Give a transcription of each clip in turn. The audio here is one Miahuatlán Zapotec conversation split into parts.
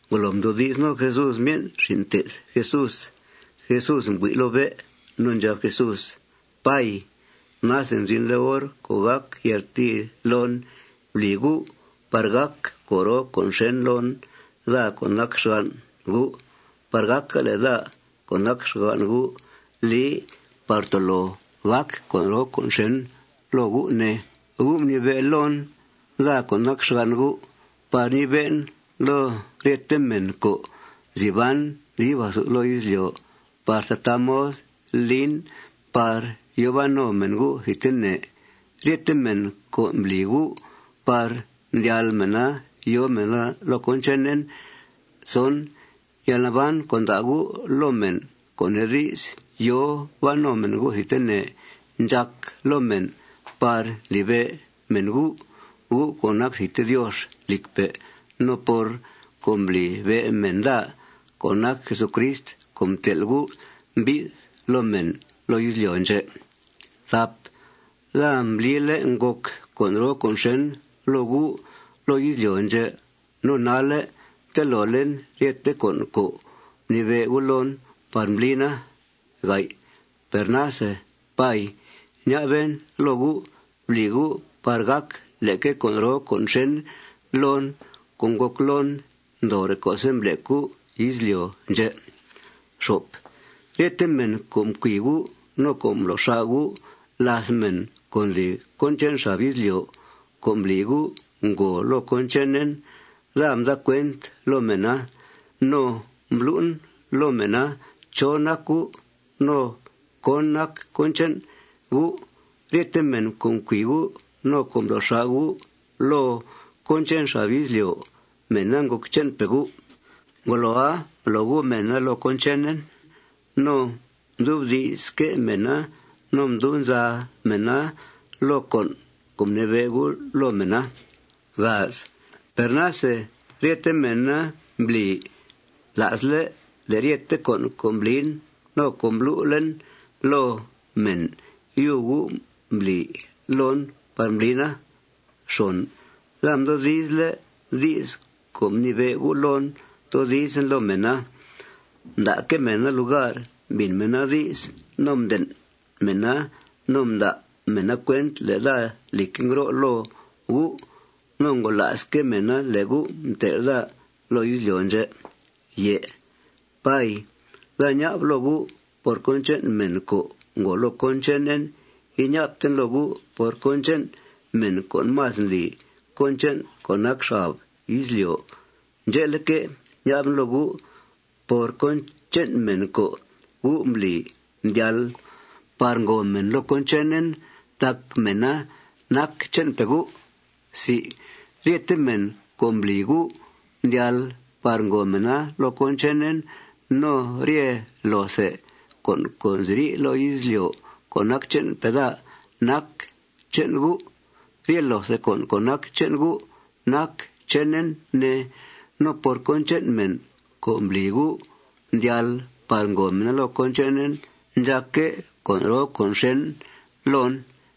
Ngolo mdoodi's no Jesús myen' xin' mté'th Jesús, Jesús mbui' loo bé'. No ndxab Jesús: ―Pay, nase mzinle' hor co' gàc yaltii loon. Bli U' par gàc con' roo con' xèn loon, daa co' nac xgan' U', par gàca le' daa co' nac xgan' U' li par tolo gàc con' roo con' xèn loo U', ne. U' mnibe' loon, daa co' nac xgan' U', par ñibe'en loo ryete mèn co' nzi ban dib athu loo izlyo' par tataa mod lin par yòo ban no mèn U' thidtene, ryete mèn co' mbli U' par mdyal mèna yòo mèna loo cón chenen. Yalnaban co' nda' U' loo mèn, co' nee di's, yòo ban no mèn U' thidtene ndxàc loo mèn por ndlibe' mèn U', U' co' nac thidte Diox lìcpe', no por mblibe' mèn daa co' nac Jesucrist co' mtel' U' mbi'th loo mèn loo izlyo' ndxè'. Daa mblile' ngòc con' roo con' xèn loo U' loo izlyo' ndxè'. No nalle' mtelolen ryethe con' co' mnibe' U' loon par mblina. Per nase, Pay, ña'ben loo U': Bli U' par gàc leque con' roo con' xèn loon co' ngòc loon ndoore' co'se' mblec U' izlyo' ndxè'. Ryete mèn co' mcui' U' no co' mblo' xà' U' làth mèn co' ndli cón che'n xab izlyo' co' mbli U' ngòo loo cón chenen, daa mda cuent loo mèna no mblu'en loo mèna chó nac U' no cón nac cón che'n U'. Rye mèn co' mcui U' no co' mblo' xà' U' loo cón che'n xab izlyo', mèna ngòc che'npe' U'. Ngoloa, mblo U' mèna loo cón chenen. No mdubdi'sque' mèna no mdub nza mèna loo con' mnibe' U' loo mèna. Per nase ryete mèna mbli la'sle' le' ryete con' co' mblin no co' mblu'en loo mèn, yub U' mbli loon par mblina. Daa mdoodizle' di's co' mnibe' U' loon toodizen loo mèna. Mda'que' mèna lugar mbìn mèna di's. No mden' mèna no mda' mèna cuent le' daa, lìcque', ngro' loo U'. No ngola'sque' mèna le' U' mtel' daa loo izlyo' ndxè'. Pay, daa ña'b loo U' por cón che'n mèn co' ngòo loo cón chenen. Iña'bten loo U' por cón che'n mèn co' más ndli cón che'n co' nac xab izlyo'. Ndxe'leque', ña'ben loo U' por cón che'n mèn co' U' mbli mdyal par ngòo mèn loo cón chenen tac mèna nac che'npe' U'. Ryete mèn co' mbli U' mdyal par ngòo mèna loo cón chenen no rye loothe con' co' nziri' loo izlyo' co' nac che'npe' daa nac che'n U'. Rye loothe con' co' nac che'n U' nac chenen, ne. No por cón che'n mèn co' mbli U' mdyal par ngòo mèna loo cón chenen ndxàcque' con' roo con' xèn loon.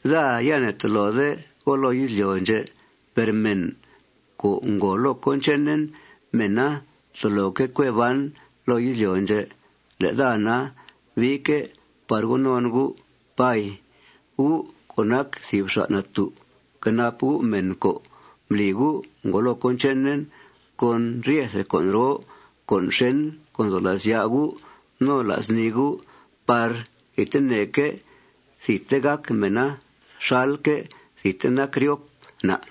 Daa ya ne'tolode go loo izlyo' ndxè'. Per mèn co' ngòo loo cón chenen, mèna toloque' cue ban loo izlyo' ndxè'. Le' daa na, biique' par go non U'. Pay, U' co' nac thìb xa' natú', fquenap U' mèn co' mbli U' ngòo loo cón chenen con ryethe con' roo con' xèn co' nzo la's ya' U' no la's nii U' par thidteneque' thidte gàc mèna xalque' thidte nac ryop na'.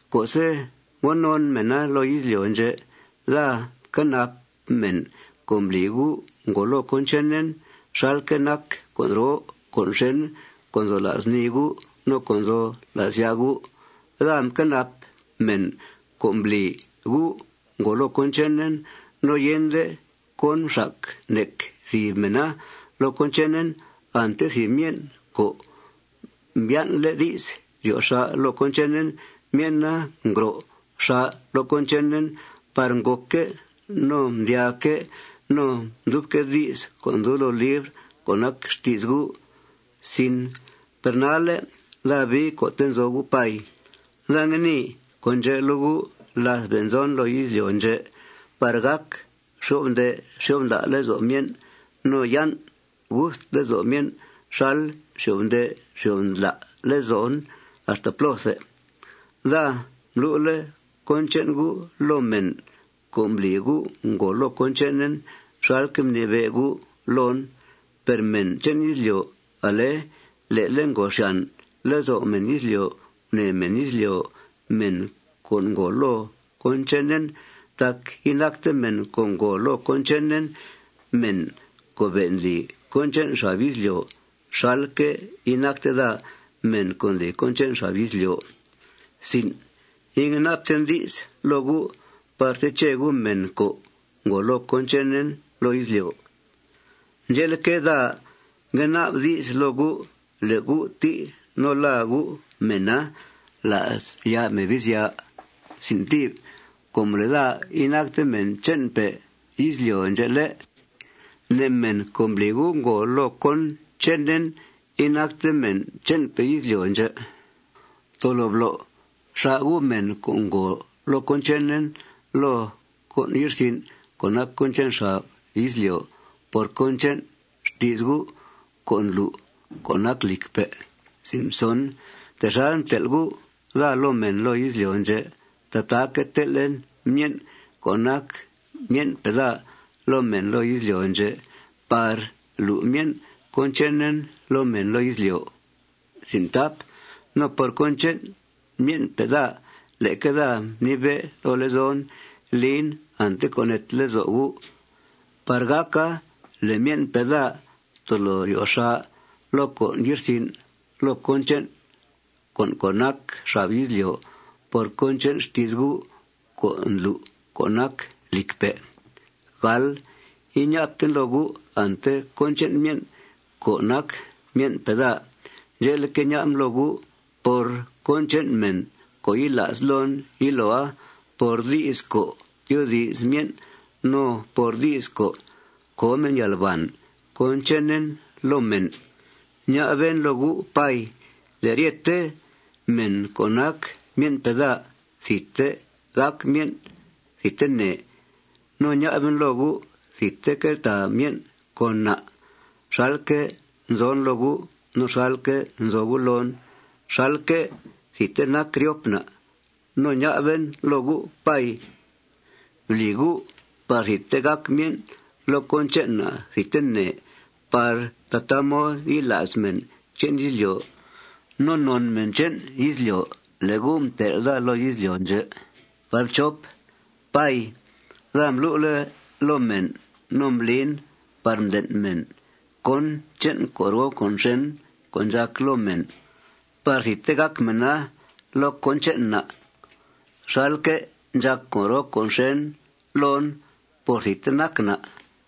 Co'se' ngo non mèna loo izlyo' ndxè', daa mquenap mèn co' mbli U' ngòo loo cón chenen xalque' nac con' roo con' xèn co' nzo la's nii U' no co' nzo la's ya' U'. Daa mquenap mèn co' mbli U' ngòo loo cón chenen. No yende cón mxac nec thìb mèna loo cón chenen, ante thìb myen' co' mbyan'le' di's ryo xà' loo cón chenen, myen'a ngro xà' loo cón chenen par ngòcque' no mdyaaque' no mdyubque' di's co' ndub loo libr co' nac xti's U'. Per nalle' daa bii co'te' nzo U', Pay. Daa ngue nii con' ndxè' loo U' láth be' nzon loo izlyo' ndxè' par gàca xyo'f nde' xyo'f ndla' lezo' myen' no yan' gust lezo' myen' xal nxyo'f nde' nxyo'f ndla' lezon axta plóthe. Daa mblu'le' cón che'n U' loo mèn co' mbli U' ngòo loo cón chenen xalque' mnibe' U' loon. Per mèn che'n izlyo', ale' le'le' ngòo xyàn lezo' mèn izlyo' gunèe mèn izlyo' mèn co' ngòo loo cón chenen. Tac inacte mèn co' ngòo loo cón chenen mèn co' be' ndli cón che'n xab izlyo' xalque' inacte daa mèn co' ndli cón che'n xab izlyo'. Ingue na'bten di's loo U' par teche U' mèn co' ngòo loo cón chenen loo izlyo'. Ndxe'leque', daa ngue na'b di's loo U' le' U' tí' no làa U' mèna la's ya' Mebizya. Com le' daa inacte mèn che'npe' izlyo' ndxè', ¿lé'?, ne' mèn co' mbli U' ngòo loo cón chenen inacte mèn che'npe' izlyo' ndxè'. Tolo blo' xà' U' mèn co' ngòo loo cón chenen loo con' ye'rsin' co' nac cón che'n xab izlyo' por cón che'n xti's U' co' ndlu' co' nac lìcpe'. Texal mtel' U' daa loo mèn loo izlyo' ndxè', tataaque' tel'en myen' co' nac myen'pe' daa loo mèn loo izlyo' ndxè' par lu' myen' cón chenen loo mèn izlyo'. No por cón che'n myen'pe' daa, leque daa mnibe' loo lezon lin ante co' neete lezo' U' par gàca le' myen'pe' daa tolo ryo xà' loo con' ye'rsin' loo cón che'n co' nac xab izlyo' por cón che'n xti's U' co' ndlu' co' nac lìcpe'. Per iña'bten loo U' ante cón che'n myen' co' nac myen'pe' daa. Ndxe'leque', ña'ben loo U' por cón che'n mèn co' yila's loon yiloa por di's co' tyoodi's myen' no por di's co' co myen' yalbàn cón chenen loo mèn. Ña'ben loo U', Pay, le' ryete mèn co' nac myen'pe' daa thidte gàc myen' thidtene. No ña'ben loo U' thidte queltàa myen' con na' xalque' nzon loo U' no xalque' nzo U' loon xalque' thidte nac ryop na'. No ña'ben loo U', Pay, bli U' par thidte gàc myen' loo cón che'n na' thidtene par tataa mod yila's mèn che'n izlyo' no non mèn che'n izlyo' le' U' mtel' daa loo izlyo' ndxè'. Pay, daa mblu'le' loo mèn no mblin par mden' mèn cón che'n con' roo con' xèn co' ndxàc loo mèn par thidte gàc mèna loo cón che'n na' xalque' ndxàc con' roo con' xèn loon por thidte nac na'.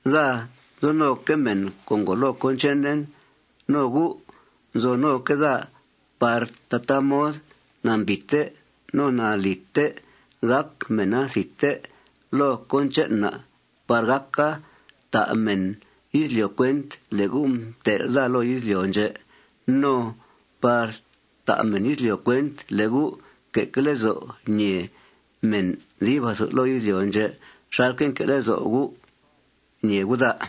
Daa nzo noque' mèn co' ngòo loo cón chenen. No U' nzo noque' daa par tataa mod nambìite no nalìte gàc mèna thidte loo cón che'n na' par gàca ta' mèn izlyo' cuent le' U' mtel' daa loo izlyo' ndxè'. No par ta' mèn izlyo' cuent le' U' nque'que' lezo' ñèe mèn dib athu loo izlyo' ndxè' xalque' nque' lezo' U' ñèe U' daa.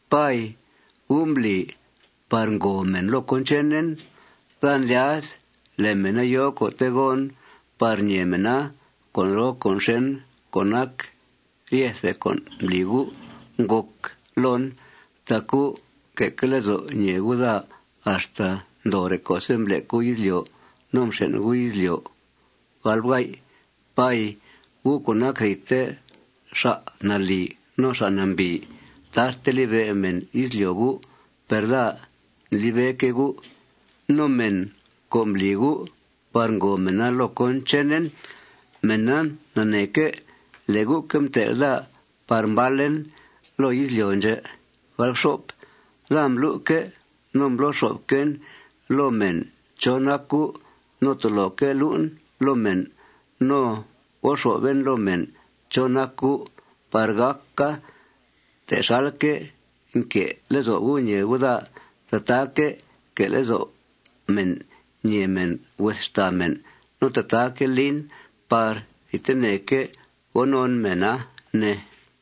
Pay, U' mbli par ngòo mèn loo cón chenen. Daa ndlya's le' mèna yòo co'te' gon par ñèe mèna con' roo con' xèn co' nac ryethe con' mbli U' ngòc loon. Tac U' nque'que' lezo' ñèe U' daa axta ndoore' co'se' mblec U' izlyo' no mxen' U' izlyo'. Pay, U' co' nac thidte xa' nalì no xa' nambìi, tarte libe' mèn izlyo' U'. Per daa ndlibeque' U'. No mèn co' mbli U' par ngòo mèna loo cón chenen, mèna naneeque' le' U'que' mtel' daa par mbalen loo izlyo' ndxè'. Daa mblu'que' no mblo xo'fquen loo mèn chó nac U'. No toloque' lu'en loo mèn no go xo'fen loo mèn chó nac U' par gàca texalque' nque' lezo' U' ñèe U' daa, tataaque' que' lezo' mèn ñèe mèn hues xtàa mèn. No tataaque' lin par thidteneque' go non mèna, ne.